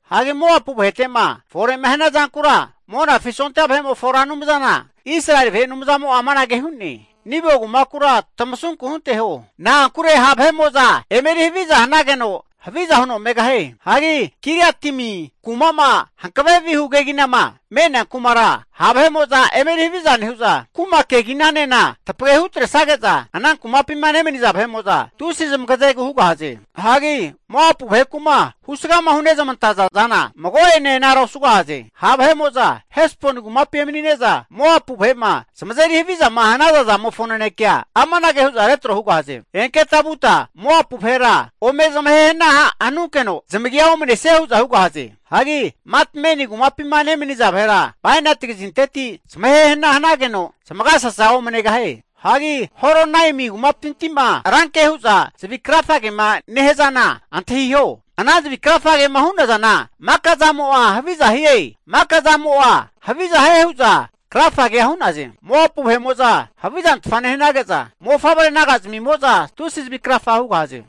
Hagi Moapu vahete'ma fore'ma hania zankura, Monafi sondia vahe'mofo Ra Anumzana Israeli vahe Anumzamo'a amanage hu'ne. Nebo kumakura tamasunku hunteho, na'ankure ha' vahe'mo'za eme eri haviza hanageno, haviza huno megahie. Hagi Kiriataimi kuma'ma hankave vihu keginama me'nea kumara, ha' vahe'mo'za eme eri haviza nehu'za, kuma keginanena tapage hutresage'za, ana kumapima nemaniza vahe'mo'za tusi zamagazegu hugahaze. Hagi Moapu vaheku'ma husgama hunezmantaza zana mago'ene anara osugahaze. Ha' vahe'mo'za Hesboni kumapi emanine'za, Moapu vahe'ma zamazeri havizama hanaza zamofo nanekea amanage hu'za retro hugahaze. Enketa vuta Moapu vahera ome zamahe hana hanunkeno zamagia omanesie huza hugahaze. Hagi Matmeni kumapima nemaniza vahera bainati kazinteti zamahe hana hanageno zamagasasa omanegahie. Hagi Horonaimi kumapinti'ma ranke hu'za tusi zavi krafagema nehazana antahiho. Ana zavi krafagema hunazana maka'zamo'a haviza hie, maka'zamo'a haviza hie hu'za krafagea hu'naze. Moapu vahe'mo'za havizantfa nehanage'za, mofavre naga zamimo'za tusi zavi krafa hugahaze.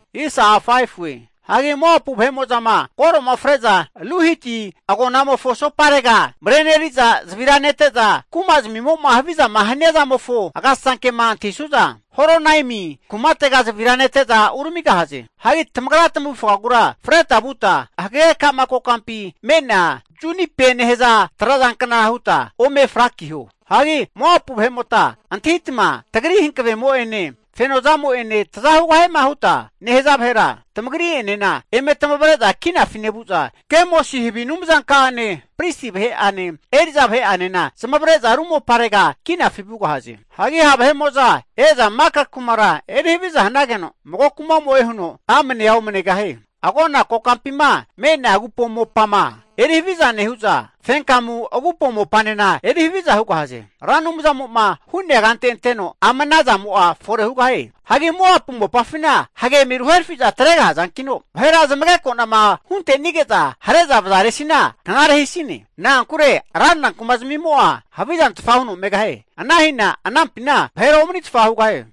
Hagi Moapu vahe'mo'zama koro'ma fre'za Luhiti agonamofo asoparega mareneri'za zavira nete'za, kuma zamimo'ma havizama hania zamofo agasasankema antahisu'za, Horonaimi kumatega zavira nete'za uramigahaze. Hagi tamagra tamavufagura freta vuta, hagage kama kokampi me'nea junipe nehaza trazankna huta ome frakiho. Hagi Moapu vahe'mota antahitama tagri hankavemo'ene, fenozamo'ene taza hugahiema huta nehaza vahera, tamagri'enena eme tamavre'za kinafi nevu'za, Kemosi havi anumzanka'ane, pristi vahe'ane, eri'za vahe'anena zamavare'za ru moparega kinafi vugahaze. Hagi ha' vahe'mo'za e'za maka kumara eri haviza hanageno, mago kumamo'e huno amnea omanigahie. Agona kokampima me'nea agupo mopama eri haviza nehu'za, fenkamu agupo mopanena eri haviza hugahaze. Ra Anumzamo'ma hu'nea kante anteno ama ana zamo'a fore hugahie. Hagi Moapu mopafina hage eme ruherafi atregahazankino, vahera zamageko'nama hunte'nige'za hare'za vazaresina knare hisine. Na'ankure ranra kumazmimo'a havizantfa huno megahie. Ana hina anampina vahera omanitfa hugahie.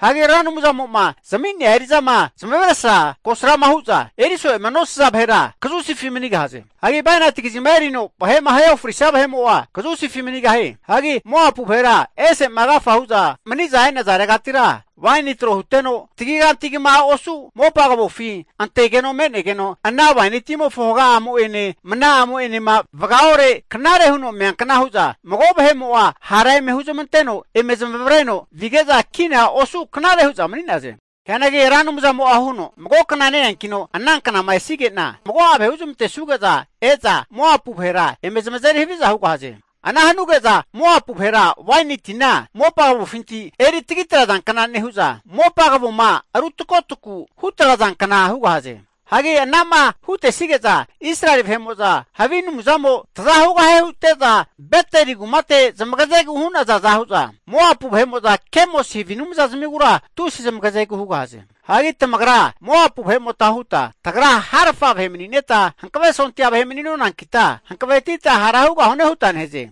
Hagi Ra Anumzamo'ma zami'nea eri'zama zamavesra kosrama hu'za eriso'ema nosaza vahera kazusifi manigahaze. Hagi bainati kazima erino vahe'ma ahe ofrisia vahe'mo'a kazusifi manigahie. Hagi Moapu vahera ese'ma agafa hu'za mani'za e'nazaregatira, waini tro huteno tagiganti kama osu mopa kavofi antegeno me'negeno, ana waini timofo haga'amo'ene mna'amo'ma vagaore knare huno meankna hu'za mago vahe'mo'a hara eme huzmanteno eme zamavreno vige'za kina osu knare hu'za mani'naze. Hianagi Ra Anumzamo'a huno, mago kna ne-eanki'na ana knama esige'na mago'a vahe huzmantesuge'za e'za Moapu vahera eme zamazeri haviza hugahaze. Ana hanuge'za Moapu vahera waini tina mopa kavofinti eri tagi trazankna nehu'za, mopa kavoma ru takotaku hutrazankna hugahaze. Hagi ana'ma hutesige'za, Israeli vahe'mo'za havi anumzamo taza hugahie hute'za Beteli kumate zamagazegu hu'nazaza hu'za, Moapu vahe'mo'za Kemosi havi anumzazmigura tusi zamagazegu hugahaze. Hagi tamagra Moapu vahe'mota huta, tagra harfa vahe manineta hankave sondia vahe mani'nonankita, hankavetita hara hugahune huta nehaze.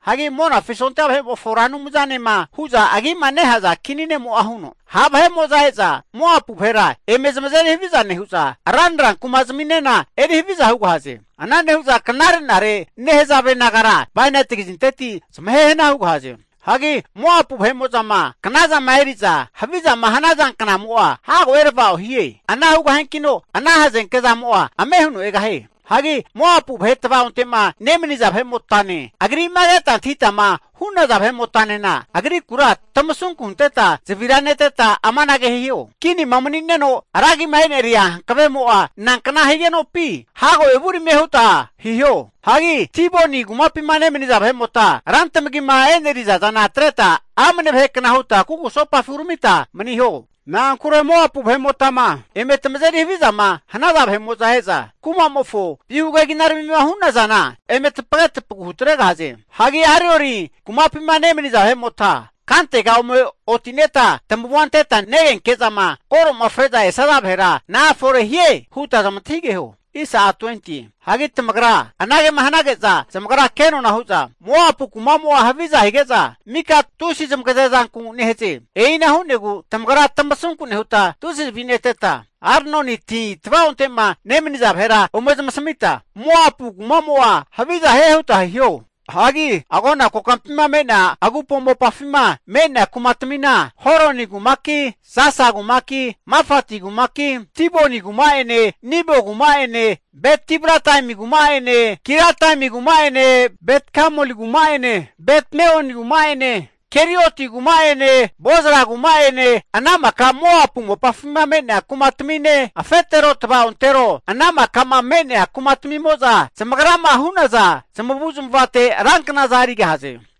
Hagi Monafi sondia vahe'mofo Ra Anumzanema hu'za agima nehaza Kini ne'mo'a huno, ha' vahe'mo'za e'za Moapu vahera eme zamazeri haviza nehu'za, ranra kuma'zaminena eri haviza hugahaze. Ana nehu'za knare'nare nehazave nagara bainati kazinteti zamahe hana hugahaze. Hagi Moapu vahe'mo'zama knazama eri'za havizama hanaza knamo'a hago erava'o hie. Ana hugahiankino ana hazenke zamo'a ame huno egahie. Hagi Moapu vahe tvaonte'ma nemaniza vahe'motane, agri'ma keta antahitama hu'naza vahe'motanena, agrikura tamasunku hunteta zavira neteta amanage hiho. Kinima mani'neno ragima e'neria hankavemo'a nankna higenopi, hago evuramie huta hiho. Hagi Diboni kumapima nemaniza vahe'mota rantamagima e'neriza zana atreta amne vahekna huta kugusopafi uramita maniho. Na'ankure Moapu vahe'motama eme tamazeri havizama hanaza vahe'mo'za e'za kumamofo vihu keginaramima hu'nazana eme tapage tapagu hutregahaze. Hagi Aroeri kumapima nemaniza vahe'mota kantega ome oti'neta tamavua anteta negenke'zama koro'ma fre'za esaza vahera na'a fore hie? huta zamantahigeho. Hagi tamagra anagema hanage'za zamagra kenona hu'za, Moapu kumamo'a haviza hige'za, mika vahe'mo'za tusi zamagaze zanku nehaze. E'ina hu'negu tamagra tamasunku nehuta tusi zavi neteta, Arnoni ti tva'onte'ma nemaniza vahera ome zamasamita, Moapu kumamo'a haviza hie huta hiho. Hagi agona kokampima me'nea agupo mopafima me'nea kumatamina, Holoni kumaki, Jasa kumaki, Mafati kumaki, Diboni kuma'ene Nebo kuma'ene Bet-diblataimi kuma'ene, Kiriataimi kuma'ene Bet-gamuli kuma'ene Bet-meoni kuma'ene, Kerioti kuma'ene Bozra kuma'ene, ana maka Moapu mopafima me'nea kumatamine, afetero tva'ontero ana maka'ma me'nea kumatamimo'za zamagrama hu'naza zamavu'zmavate ranknaza erigahaze.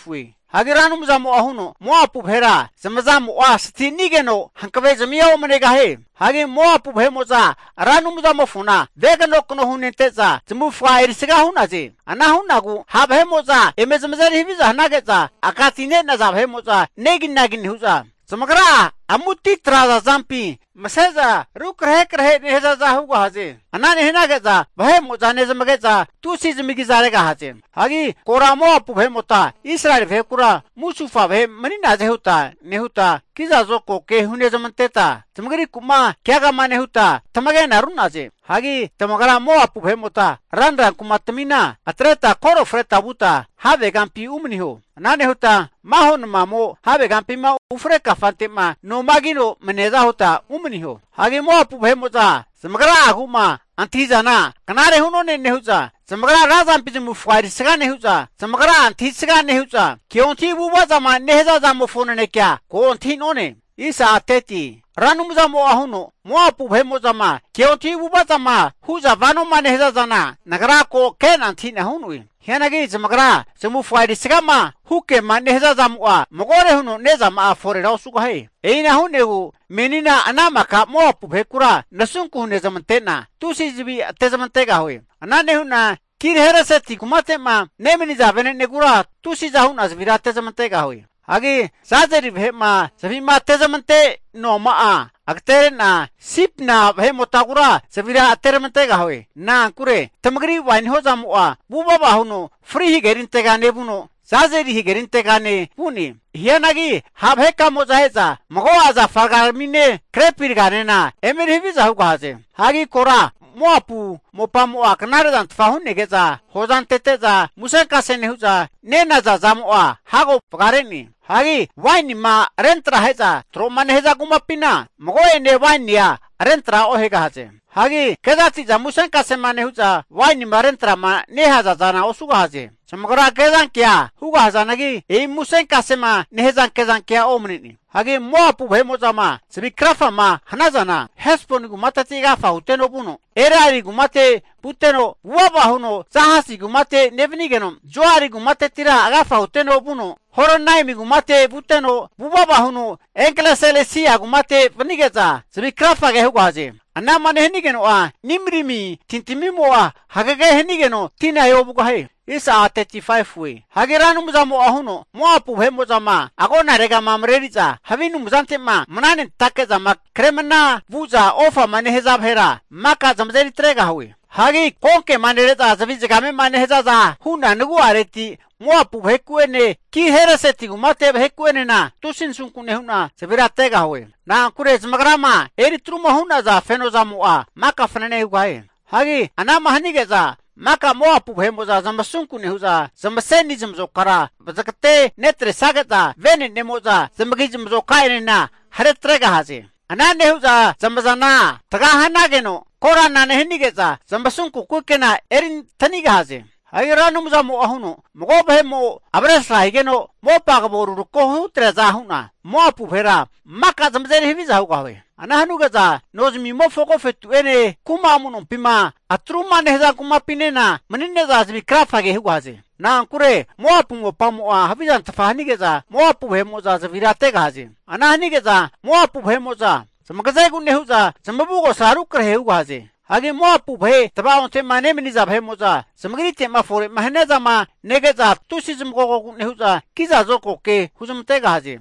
Hagi Ra Anumzamo'a huno, Moapu vahera zamazamo'a stinigeno hankave zamia omanegahie. Hagi Moapu vahe'mo'za Ra Anumzamofona veganokano hunente'za, zamavufaga erisga hu'naze. Ana hu'negu ha' vahe'mo'za eme zamazeri haviza hanage'za, aka ti ne'naza vahe'mo'za neginagi nehu'za, zamagra'a amuti trazampi mase'za rukrahekrehe nehazaza hugahaze. Ana nehanage'za vahe'mo'za nezamage'za tusi zamagizaregahaze. Hagi kora Moapu vahe'mota Israeli vahekura musufa vahe mani'naze huta nehuta, kiza zokagoke hune zamanteta, zamagriku'ma keagama nehuta tamagena ru'naze. Hagi tamagra Moapu vahe'mota ranra kumatamina atreta koro freta vuta havegampi umaniho. Ana nehuta maho namamo havegampima ufre kante'ma noma kino maniaza huta umaniho. Hagi Moapu vahe'mo'za zamagra'agu'ma antahi'zana knare hu'none nehu'za, zamagra razampi zamavufaga erisga nehu'za, zamagra'a antahisga nehu'za, keontahi avu'ava zama nehaza zamofo nanekea ko antahi'none. Ra Anumzamo'a huno, Moapu vahe'mo'zama keontahi avu'ava zama hu'za vanoma nehaza zana Nagra ko ke'na antahi'na hu'noe. Hianagi zamagra zamavufa erisgama hu kema nehaza zamo'a magore huno ne'zama'a forera osugahie. E'ina hu'negu menina ana maka Moapu vahekura nasunku hunezamante'na tusi zavi ate'zmantegahue. Ana nehu'na Kir-hareseti kumate'ma nemaniza vene'negura tusiza hu'na zavira ate'zmantegahue. Hagi Jazeri vahe'ma zavi'ma atezamante noama'a agatere'na Sibma vahe'motagura zavira ateramantegahue. Na'ankure tamagri waini hozamo'a vuvava huno Fri Hagerintega nevuno, Jazeri hagerintegane vu'ne. Hianagi ha' vahekamo'za e'za mago'a zafa ragaramine grepi raganena emeri haviza hugahaze. Hagi kora Moapu mopamo'a knare zantfa hu'nege'za hoza antete'za musenkase nehu'za nenaza zamo'a hago vagare'ne. Hagi wainima rentra ahe'za tro'ma nehaza kumapina mago'ene wainia rentra ohegahaze. Hagi kezati'za musenkasema nehu'za wainima rentra'ma nehaza zana osugahaze. Zamagra kezankea hugazanagi, e'i musenkasema nehaza kezankea omane'ne. Hagi Moapu vahe'mo'zama zavi krafama hanazana, Hesboni kumateti agafa huteno vuno, Eleale kumate vuteno, vuvava huno Jahasi kumate nevanigeno, Zoari kumatetira agafa huteno vuno, Haronaimi kumate vuteno, vuvava huno Eglat-Selisia kumate vanige'za zavi krafa hugahaze. Anama nehanigeno'a Nimrimi tintamimo'a hagege hanigeno tina e'ovugahie. Hagi Ra Anumzamo'a huno, Moapu vahe'mo'zama agonaregama mareri'za havi anumzante'ma mananentake zama kremana vu'za ofama nehaza vahera maka zamazeri atregahue. Hagi konkema nere'za zavi nehazaza hu'na nagu'areti Moapu vaheku'ene Kir-hareseti kumate vaheku'enena tusi nasunku nehu'na zavira ategahue. Na'ankure zamagrama eri truma hu'naza feno zamo'a maka fanane hugahie. Hagi ana'ma hanige'za maka Moapu vahe'mo'za zamasunku nehu'za zamaseni zamazokara vazagate netresage'za vene'nemo'za zamagi zmazoka'enena hare tregahaze. Ana nehu'za zamazana taga hanageno korana nehanige'za, zamasunku kukena erintanigahaze. Hagi Ra Anumzamo'a huno, Mago vahe'mo avesra higeno mopa kavo rurako hutreaza hu'na, Moapu vahera maka zamazeri haviza hugahue. Ana hanuge'za nozamimofo agofetu'ene kuma amu'nompima atruma nehaza kumapinena manine'za zavi krafa hugahaze. Na'ankure Moapu mopamo'a havizantfa hanige'za Moapu vahe'mo'za zavira ategahaze. Ana hanige'za Moapu vahe'mo'za zamagazegu nehu'za zamavugosa rukrahe hugahaze. Hagi Moapu vahe tva'onte'ma nemaniza vahe'mo'za zamagrite'ma fore'ma hania zama nege'za tusi zamagogogu nehu'za, kiza zokago ke huzmantegahaze.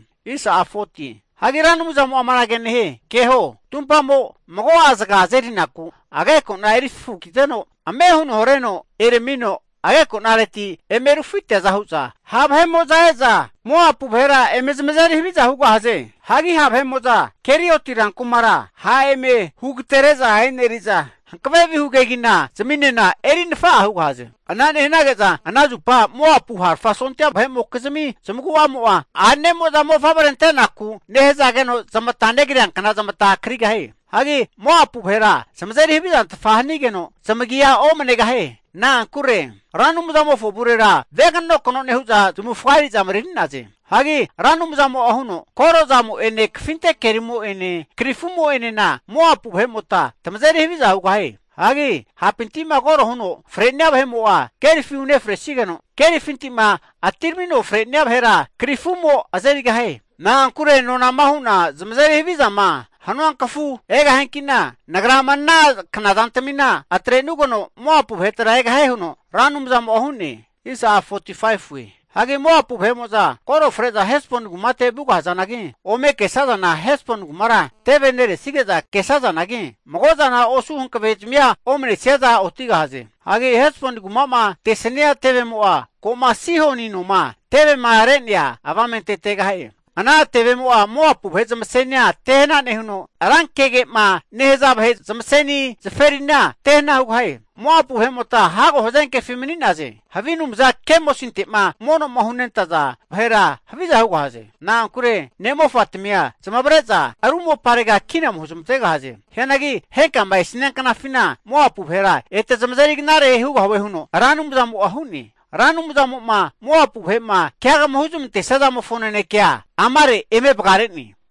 Hagi Ra Anumzamo'a amanage nehie, Keho! Tumpamo mago'a zaga azerinaku ageko'na eri fafukiteno ame huno hareno eramino ageko'nareti eme rufiteaza hu'za, ha' vahe'mo'za e'za Moapu vahera eme zamazeri haviza hugahaze. Hagi ha' vahe'mo'za Kerioti rankumara ha' eme hugatere'za eneri'za, hankave vihu kegina zaminena eri nafa'a hugahaze. Ana nehanage'za ana zupa Moapu harafa sondia vahe'mokizmi zamagu'amo'a a'nemo'za mofavre antenaku nehazageno zamata negriankna zamata krigahie. Hagi Moapu vahera zamazeri havizantfa hanigeno zamagia omanegahie. Na'ankure Ra Anumzamofo avurera veganokano nehu'za zamavufaga eri'za mareri'naze. Hagi Ra Anumzamo'a huno, Koro zamo'ene kafinte kerimo'ene krifumo'enena Moapu vahe'mota tamazeri haviza hugahie. Hagi hapinti'ma koro huno fre'nia vahe'mo'a kerifi unefresigeno, kerifinti'ma atiramino fre'nia vahera krifumo azerigahie. Na'ankure nonama hu'na zamazeri havizama hanua kafu egahianki'na, Nagra ama ana knazantamina atre'nugeno Moapu vahetera egahie huno Ra Anumzamo'a hu'ne. Hagi Moapu vahe'mo'za koro fre'za Hesboni kumate vu'gahazanagi, ome kesazana Hesboni kumara teve neresige'za kesazanagi, mago zana osu hankave'zami omanesiaza otigahaze. Hagi Hesboni kuma'ma tesania tevemo'a ko'ma Sihoni noma tevema re'nea avamente tegahie. Ana tevemo'a Moapu vahe zamasenia tehana nehuno, rankege'ma nehaza vahe zamaseni zaferina tehana hugahie. Moapu vahe'mota hago hazenkefi mani'naze. Havi anumza Kemosinte'ma mono'ma hunentaza vahera haviza hugahaze. Na'ankure ne'mofatamia zamavare'za ru moparega kina ome huzmantegahaze. Hianagi henkama esia knafina Moapu vahera ete zamazeri knare hugahue huno Ra Anumzamo'a hu'ne. Ra Anumzamo'ma Moapu vahe'ma keagama huzmantesia zamofo nanekea amare eme vagare'ne.